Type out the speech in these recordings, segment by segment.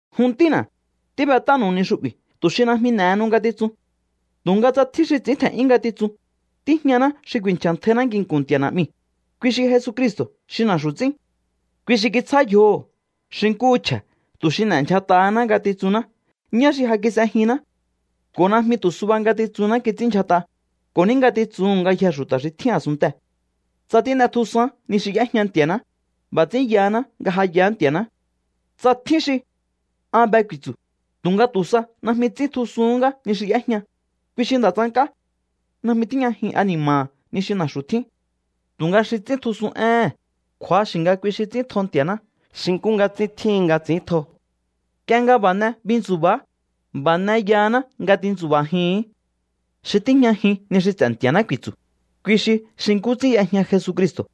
Jun ntína̱, tíb'et'ánu̱u ni xu'bi̱ tu̱ xi najmi n'e̱henu ngatitsun. Tu̱nga tsa tjín xi ts'i̱ín tje̱n'yún ngatitsun, tíjñaná xi ku̱i̱nchja̱ntjainá nginku̱n Nti̱a̱ Na̱'miu̱, kui xi Jesucristo̱ xi na̱xu̱ ts'ín. Kui xi kitsjá yjoho̱ xi nkúhu chje̱ tu̱ xi n'e̱ndyjat'ahaná ngatitsunná ñá xi ja kis'ejinná. Ko̱ najmi tu̱ suba ngatitsunná kits'ínndyjat'a, ko̱ ní ngatitsuhu̱n ngayjee̱ xu̱ta̱ xi tjín a̱sunntee̱. Tsa tín'etjusaán ni xi y'éjña Nti̱a̱ná, b'a̱ ts'ín yahaná nga ja yaá Nti̱a̱ná. Tsa tjín xi: “An be” ku̱i̱tsu̱, tu̱nga tu̱ sa najmi ts'íntjusuhún ngá ni xi y'éjña, kui xi nda̱ tsank'á. Najmi tíjñajin ani̱ma̱ha̱ ni xi na̱xu̱ tjín. Tu̱nga xi ts'íntjusun éhe̱n, kju̱axi̱ nga kui xi ts'íntjo Nti̱a̱ná xi nkú nga ts'ín tjíhin nga ts'i̱íntjo. Nk'ie nga b'a̱ n'e bintsubaá, b'a̱ n'e yahaná nga tintsu̱ba̱jii̱hín. Xi tíjñajin ni xi ts'e̱ Nti̱a̱ná ku̱i̱tsu̱, kui xi xi nkú ts'ín y'ejña Jesucristo̱,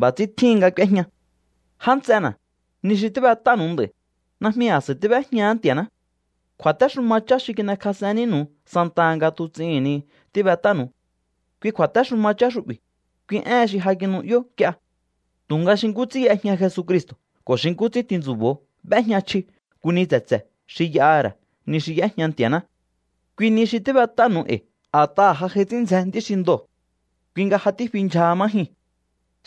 b'a̱ ts'ín tjíhin nga k'úéjña. Já nts'ena̱, ni xi tíb'et'ánu̱u nd'a̱i̱, najmi a̱s'a̱i tíb'éjñahá Nti̱a̱ná. Kju̱a̱téxuma chá xi kin'ekjas'en nínu̱u santaha nga tuts'ihi̱n ni tíbet'ánu̱u. Kui kju̱a̱téxuma chá xu'bi̱, kui éhen xi ja kinu'yó nk'ie. Tu̱nga xi nkú ts'ín y'ejña Jesucristo̱ ko̱ xi nkú ts'ín tintsu̱bo̱o b'éjña chji nku ni tse̱tse̱ xi y'aha̱ ra̱ ni xi y'éjña Nti̱a̱ná. Kui ni xi tíb'et'ánu̱u e̱i̱ a̱t'aha̱ ja j'ai ts'ín ndzjen nd'í xi ndoo̱. Kui nga ja tífi ndyjaha má jyuu̱n.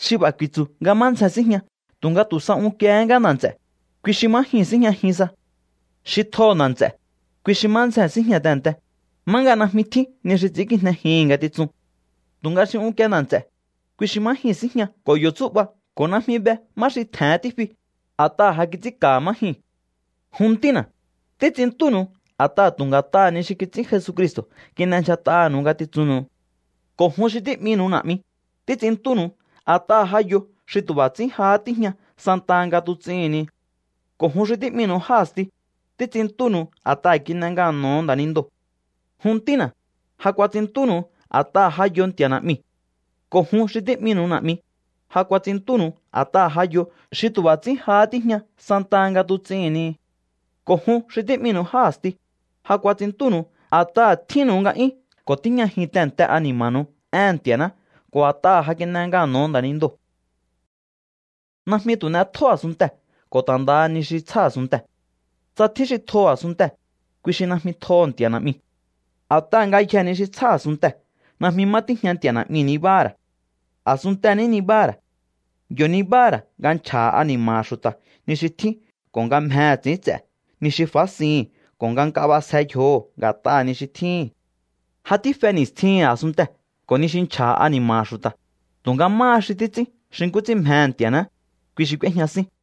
Xi b'a̱ ku̱i̱tsu̱ nga má ndzjee̱n síjña tu̱nga tu̱ sa unkiehé ngá nda̱ nts'e̱, kui xi má jyuu̱n síjñajin sa. Xi tjoho̱ nda̱ nts'e̱, kui xi má ndzjee̱n síjña tehe̱nte, má nga najmi tjín ni xi ts'i̱ínkijnejihi̱n ngatitsun. Tu̱nga xi unkie nda̱ nts'e̱, kui xi má jyuu̱n síjña ko̱ yo̱ tsú'ba ko̱ najmi be má xi tje̱hen tífi, a̱t'aha̱ ja kits'ínka̱ha̱ má jyuu̱n. Jun ntína̱, títs'inntúnu̱u a̱t'aha̱ tu̱ nga̱t'aha̱ ni xi kits'ín Jesucristo̱ kin'endyjat'aha̱nu̱u ngatitsunnu̱u. Ko̱ jun xi tí'minu̱u na̱'mi, títs'inntúnu̱u a̱t'aha̱ ja yo xi tu̱ b'a̱ ts'ín jahá tíjña santaha nga tuts'ihi̱n ni. Ko̱ jun xi tí'minu̱u já a̱sti, títs'inntúnu̱u a̱t'aha̱ kin'e ngano̱ho̱o nda̱nindoo̱. Jun ntína̱, ja kuats'inntúnu̱u a̱t'aha ja yo Nti̱a̱ Na̱'miu̱. Ko̱ jun xi tí'minu̱u na̱'mi, ja kuats'inntúnu̱u a̱t'aha ja yo xi tu̱ b'a̱ ts'ín jahá tíjña santaha nga tuts'ihi̱n ni. Ko̱ jun xi tí'minu̱u já a̱sti, ja kuats'inntúnu̱u a̱t'aha̱ tjínnu̱u nga'yún ko̱ tíjñajin tehe̱nte ani̱ma̱nu̱u éhe̱n Nti̱a̱ná ko̱ a̱t'aha̱ ja kin'e ngano̱ho̱o nda̱nindoo̱. Najmi tu̱ n'etjó a̱sunntee̱ ko̱ ta̱ ndaha ni xi tsjá a̱sunntee̱. Tsa tjín xi tjoho̱ a̱sunntee̱, kui xi najmi tjoho̱ Nti̱a̱ Na̱'miu̱. A̱t'aha̱ ngayjee̱ ni xi tsjá a̱sunntee̱ najmi má tíjña Nti̱a̱ Na̱'miu̱ nibáha̱ ra̱. A̱sunntee̱ ní nibáha̱ ra̱. Yo̱ nibáha̱ ra̱ nga nchja̱ha̱ ani̱ma̱ha̱ xu̱ta̱ ni xi tjín ko̱ nga mjehe̱ ts'i̱ínts'e̱ ni xi fásihi̱n ko̱ nga nk'a b'asje yjoho̱ nga̱t'aha̱ ni xi tjíhi̱n. Ja tífe ni̱stjihi̱n a̱sunntee̱ ko̱ ni xi nchja̱ha̱ ani̱ma̱ha̱ xu̱ta̱, tu̱nga máha xi títs'ín xi nkú ts'ín mjehe̱ Nti̱a̱ná, kui xi k'úéjña sín.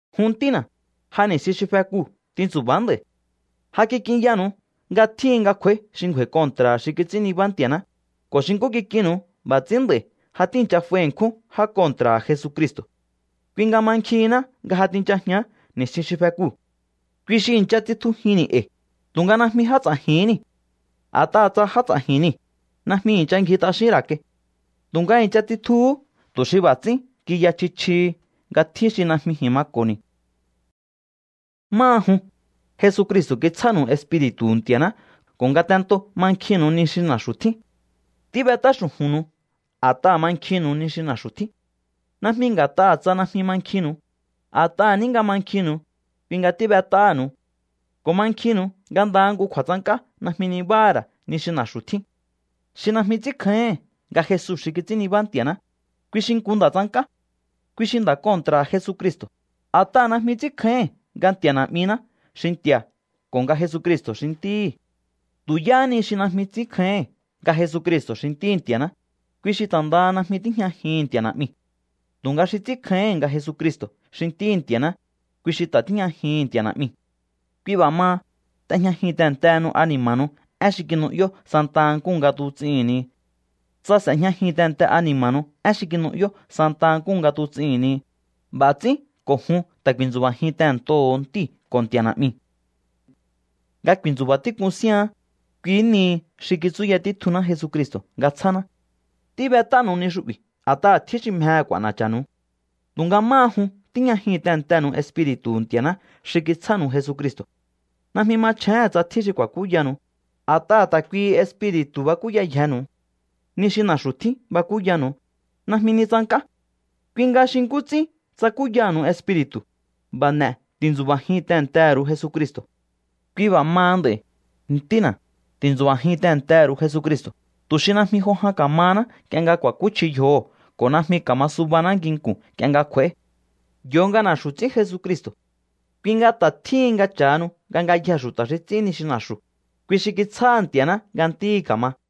Jun ntína̱, ja ni̱stjin xi fekuu̱ tintsu̱ba̱á nd'a̱i̱. Ja kik'inyanu̱u nga tjíhin nga kj'u̱a̱í xi ngju̱a̱i̱ kontra̱ha̱ xi kits'ín nibá Nti̱a̱ná, ko̱ xi nkú kik'innu̱u b'a̱ ts'ín nd'a̱i̱ ja tíi̱ncha f'ai ṉkjún já kontra̱ha̱ Jesucristo̱. Kui nga mankjihinná nga ja tinchajián ni̱stjin xi fekuu̱. Kui xi i̱ncha tsitjujínni̱ e̱i̱, tu̱nga najmi já ts'a̱ji̱hín niu̱. A̱t'aha̱ tsa já ts'a̱ji̱n niu̱, najmi i̱ncha ngji t'axín ra̱ kai. Tu̱nga i̱ncha tsitjuhú tu̱ xi b'a̱ ts'ín kiya chji chjihi nga tjín xi najmi ji̱n mako̱ni̱. Máha jun, Jesucristo̱ kitsjánu̱u Espiri̱tu̱hu̱ Nti̱a̱ná ko̱ ngatentoo̱ mankjinnu̱u ni xi na̱xu̱ tjín. Tíb'et'á xu̱ju̱nnu̱u a̱t'aha̱ mankjinnu̱u ni xi na̱xu̱ tjín. Najmi nga̱t'aha̱ tsa najmi mankjinnu̱u, a̱t'aha̱ ní nga mankjinnu̱u, kui nga tíb'et'áha̱nu̱u. Ko̱ mankjinnu̱u nga ndaha nku kju̱a̱tsank'á najmi nibáha̱ ra̱ ni xi na̱xu̱ tjín. Xi najmi ts'ínkjáíhi̱n nga Jesu xi kits'ín nibá Nti̱a̱ná, kui xi nku nda̱ tsank'á. Kui xi nda̱ kontra̱ha̱ Jesucristo̱, a̱t'aha̱ najmi ts'ínkjáíhi̱n nga Nti̱a̱ Na̱'miná xi Nti̱a̱ ko̱ nga Jesucristo̱ xi Ntíhi̱. Tu̱ yáhá ni xi najmi ts'ínkjáíhi̱n nga Jesucristo̱ xi Ntíhi̱ Nti̱aṉá, kui xi ta̱ ndaha najmi tíjñajihi̱n Nti̱a̱ Na̱'miu̱. Tu̱nga xi ts'ínkjáíhi̱n nga Jesucristo̱ xi Ntíhi̱ Nti̱aṉá, kui xi ta̱ tíjñajihi̱n Nti̱a̱ Na̱'miu̱. Kui b'a̱ maha, t'ejñajin tehe̱ntehenu ani̱ma̱nu̱u én xi kinu'yó santa nkúhu nga tuts'ihi̱n ni. Tsa s'e̱jñajin tehe̱nte ani̱ma̱nu̱u én xi kinu'yó santa nkúhu nga tuts'ihi̱n ni, b'a̱ ts'ín ko̱ jun ta̱ ku̱i̱ntsu̱ba̱jin tehe̱ntoho̱o Ntíu̱ ko̱ Nti̱a̱ Na̱'miu̱. Nga ku̱i̱ntsu̱ba̱ tík'un síaán, kui nihi xi kitsúya títjunná Jesucristo̱ nga tsjáná. Tíb'et'ánu̱u ni xu'bi̱ a̱t'aha̱ tjín xi mjehe̱ k'u̱a̱na̱cha̱nu̱u. Tu̱nga máha jun, tíjñajin tehe̱ntenu̱u Espiri̱tu̱hu̱ Nti̱a̱ná xi kitsjánu̱u Jesucristo̱. Najmi machjéhe̱n tsa tjín xi ku̱a̱kúyanu̱u, a̱t'aha̱ ta̱ kuihi Espiri̱tu̱ bakúyayjenu̱u. Ni xi na̱xu̱ tjín bakúyanu̱u, najmi ni tsank'á. Kui nga xi nkú ts'ín tsakúyaha̱nu̱u Espiri̱tu̱, b'a̱ n'e̱ ti̱ntsu̱ba̱jin tehe̱ntehe̱ ru̱u Jesucristo̱. Kui b'a̱ maha nd'a̱i̱, ntína̱, ti̱ntsu̱ba̱jin tehe̱ntehe̱ ru̱u Jesucristo̱, tu̱ xi najmi jo jan ka̱mahaná nk'ie nga ku̱a̱kúchji yjoho̱ ko̱ najmi ka̱ma subaná nginku̱n nk'ie nga kj'u̱a̱í. Yo nga na̱xu̱ ts'ín Jesucristo̱. Kui nga ta̱ tjíhin nga cha̱hanu nga ngayjee̱ xu̱ta̱ xi ts'ín ni xi na̱xu̱, kui xi kitsjáha̱ Nti̱a̱ná nga ntíhi̱ ka̱ma.